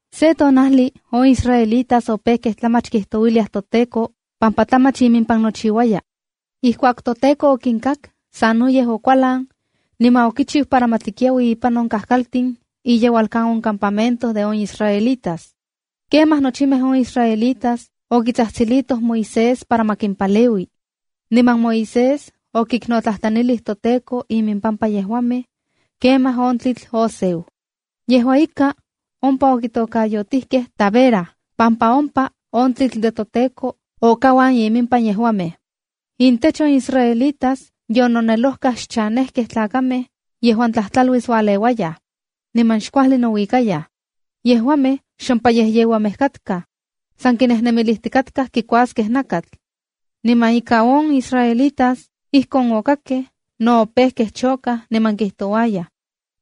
Se tonajli on israelitas opejkej tlamach kijtouiliaj toTEKO pampa tlamach impan nochiuaya. Ijkuak toTEKO okinkak, sanoyej okualan, niman okichiu para ma tlikiaui ipan on kajkaltin iyeualkan on campamento de on israelitas. Kemaj nochimej on israelitas okitsajtsilitoj Moisés para ma kimpaleui. Niman Moisés okiknotlajtlanilij toTEKO impampa yejuamej, kemaj on tlitl oseu. Yejua ika, ompa okitokayotijkej Tabera pampa ompa on tlitl de toTEKO okauan iminpan yejuamej. Intech on israelitas yononelojkaj xchanejkej tlakamej yejuan tlajtlaluis ualeuayaj, niman xkuajli nouikayaj. Yejuamej xompayejyeuamej katkaj. San kinejnemilijtikatkaj kikuaskej nakatl. Niman ika on israelitas ijkon okakkej no opejkej chokaj niman kijtouayaj: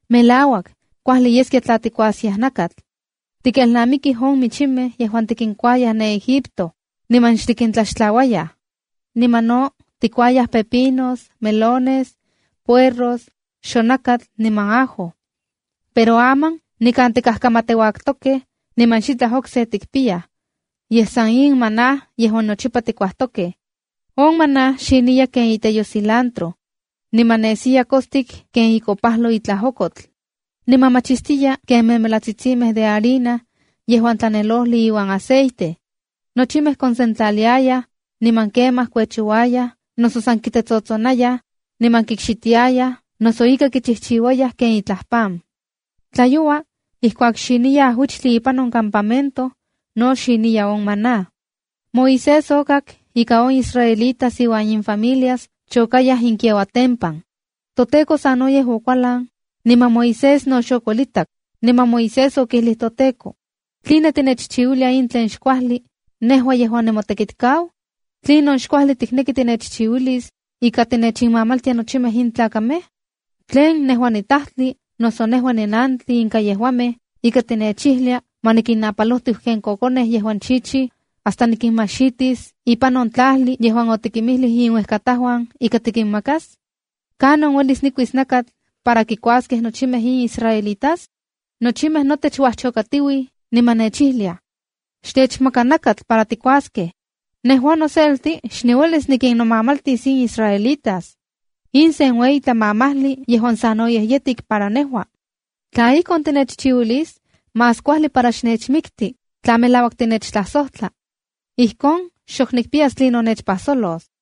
“¡Melauak, kuajli yeskia tla tikuaskiaj nakatl! Tikelnamikij on michimej yejuan tikinkuayaj ne Egipto, niman xtikintlaxtlauayaj. Niman no tikuayaj pepinos, melones, puerros, xonakatl niman ajo. Pero aman nikan tikajkamateuaktokej, niman xitlaj okse tikpiyaj, yej san in maná yejuan nochipa tikuajtokej.” On maná xiniya ken iteyo cilantro, niman nesiya kostik ken ikopajlo itlaj okotl. Niman machistiya ken memelatsitsimej de harina yejuan tlanelojli iuan aceite. Nochimej konsentlaliayaj, niman kemaj kuechouayaj noso san kitetsotsonayaj, niman kikxitiayaj noso ika kichijchiuayaj ken itlaj pan. Tlayoua, ijkuak xiniya ajuichtli ipan on campamento, no xiniya on maná. Moisés okak ika on israelitas iuan infamilias chokayaj inkiauatempan. ToTEKO sanoyej okualan, niman Moisés no xokuelitak, niman Moisés okijlij toTEKO: —¿Tline tinechchiuilia in tlen xkuajli, nejua yejuan nimotekitkau? ¿Tlinon xkuajli tikneki tinechchiuilis ika tinechinmamaltia nochimej in tlakamej? ¿Tlen nejua nitajtli noso nejua ninantli inka yejuamej ika tinechijlia ma nikinnapalojtiu ken kokonej yejuan chichij, hasta nikinmajxitis ipan on tlajli yejuan otikinmijlij inuejkatajuan ika tikinmakas? ¿Kanon uelis nikuis nakatl para kikuaskej nochimej in israelitas? Nochimej notech uajchokatiuij niman nechijliaj: “Xtechmaka nakatl para tikuaskej.” Nejua noselti xniuelis nikinnomamaltis in israelitas. In sen ueyi tlamamajli yejuan sanoyej yetik para nejua. Tla ijkon tinechchiuilis, más kuajli para xnechmikti tla melauak tinechtlajsojtla. Ijkon xok nikpiyas tlinon nechpajsolos.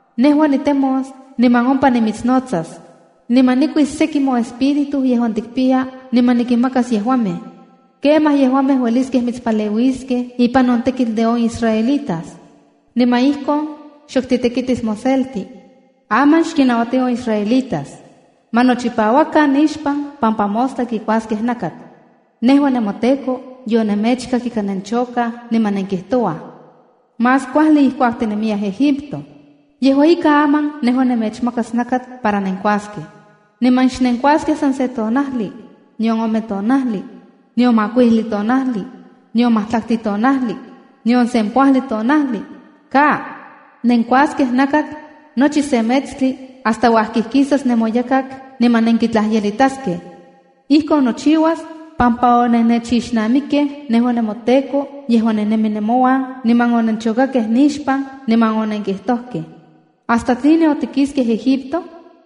Nejua nitemos niman ompa nimitsnotsas. Niman nikuis seki moespíritu yejuan tikpiya niman nikinmakas yejuamej. Kemaj yejuamej ueliskej mitspaleuiskej ipan on tekitl de on israelitas. Niman ijkon xok titekitis moselti. Aman xkinnauati on israelitas: “Ma nochipauakan nixpan, pampa mostla kikuaskej nakatl. Nejua nemoTEKO yonemechkak ika nenchokaj niman nenkijtouaj: ‘¡Más kuajli ijkuak tinemiyaj Egipto!’” Yejua ika, aman nejua nemechmakas nakatl para nenkuaskej. Niman xnenkuaskej san se tonajli, nion ome tonajli, nion makuijli tonajli, nion majtlaktli tonajli, nion sempoajli tonajli. Ka. Nenkuaskej nakatl nochi se metstli hasta uajkijkisas nemoyakak niman nenkitlajyelitaskej. Ijkon nochiuas pampa onennechixnamikkej nejua nemoTEKO yejuan ninemi nemonuan, niman onenchokakej nixpan, niman onenkijtojkej: “¿Hasta tline otikiskej Egipto?”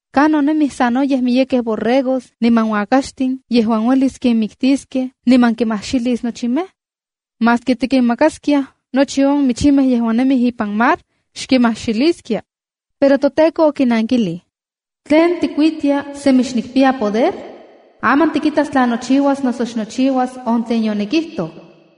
’¿Kanon nemij sanoyej miyekej borregos niman uakaxtin yejuan uelis kinmiktiskej niman kimajxilis nochimej? Maski tikinmakaskia nochi on michimej yejuan nemij ipan mar, xkimajxiliskia. Pero toTEKO okinankilij: —¿Tlen tikuitia semi xnikpiya nopoder? Aman tikitas tla nochiuas noso xnochiuas on tlen yonikijtoj.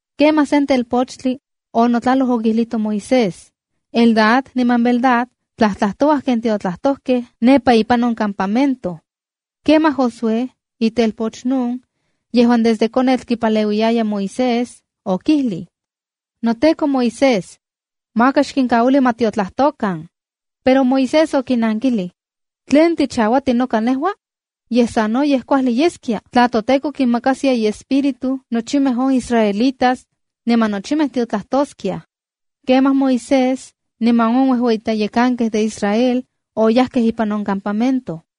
Kemaj sen telpochtli onotlaloj okijlito Moisés: —¡Eldad niman Medad tlajtlajtouaj ken tiotlajtojkej ne nepa ipan on campamento! Kemaj Josué, itelpoch Nun yejuan desde konetl kipaleuiyaya Moisés, okijlij: —NoTEKO Moisés, maka xkinkauili ma tiotlajtokan. Pero Moisés okinankilij: —¿Tlen tichauati noka nejua? Yej, sanoyej kuajli yeskia tla toTEKO kinmakaskia iespíritu nochimej on israelitas niman nochimej tiotlajtoskiaj. Kemaj Moisés niman on uejueyitlayekankej de Israel, oyajkej ipan on campamento.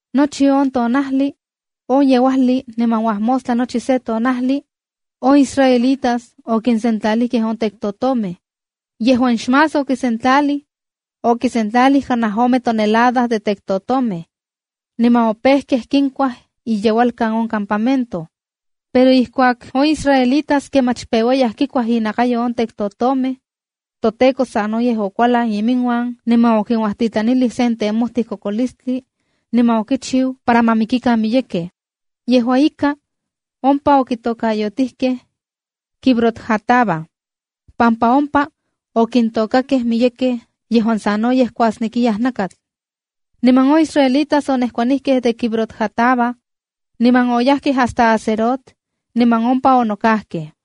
Nochi on tonajli, on yeuajli niman uajmostla nochi se tonajli, on israelitas okinsentlalijkej on tektotomej. Yejuan xmás okisentlalij, okisentlalij kanaj ome tonelada de tektotomej. Niman opejkej kinuatsaj iyeualkan on campamento. Pero ijkuak on israelitas kemach peuaya kikuaj innakayo on tektotomej, toTEKO sanoyej okualan iminuan niman okinuajtitlanilij sen temojtij kokolistli niman okichiu para ma mikikan miyekej. Yejua ika, ompa okitôkayotijkej Kibrot-hataavaa, pampa ompa okintokakej miyekej yejuan sanoyej kuasnekiyaj nakatl. Niman on israelitas onejkuanijkej de Kibrot-hataava niman oyajkej hasta Hazerot niman ompa onokajkej.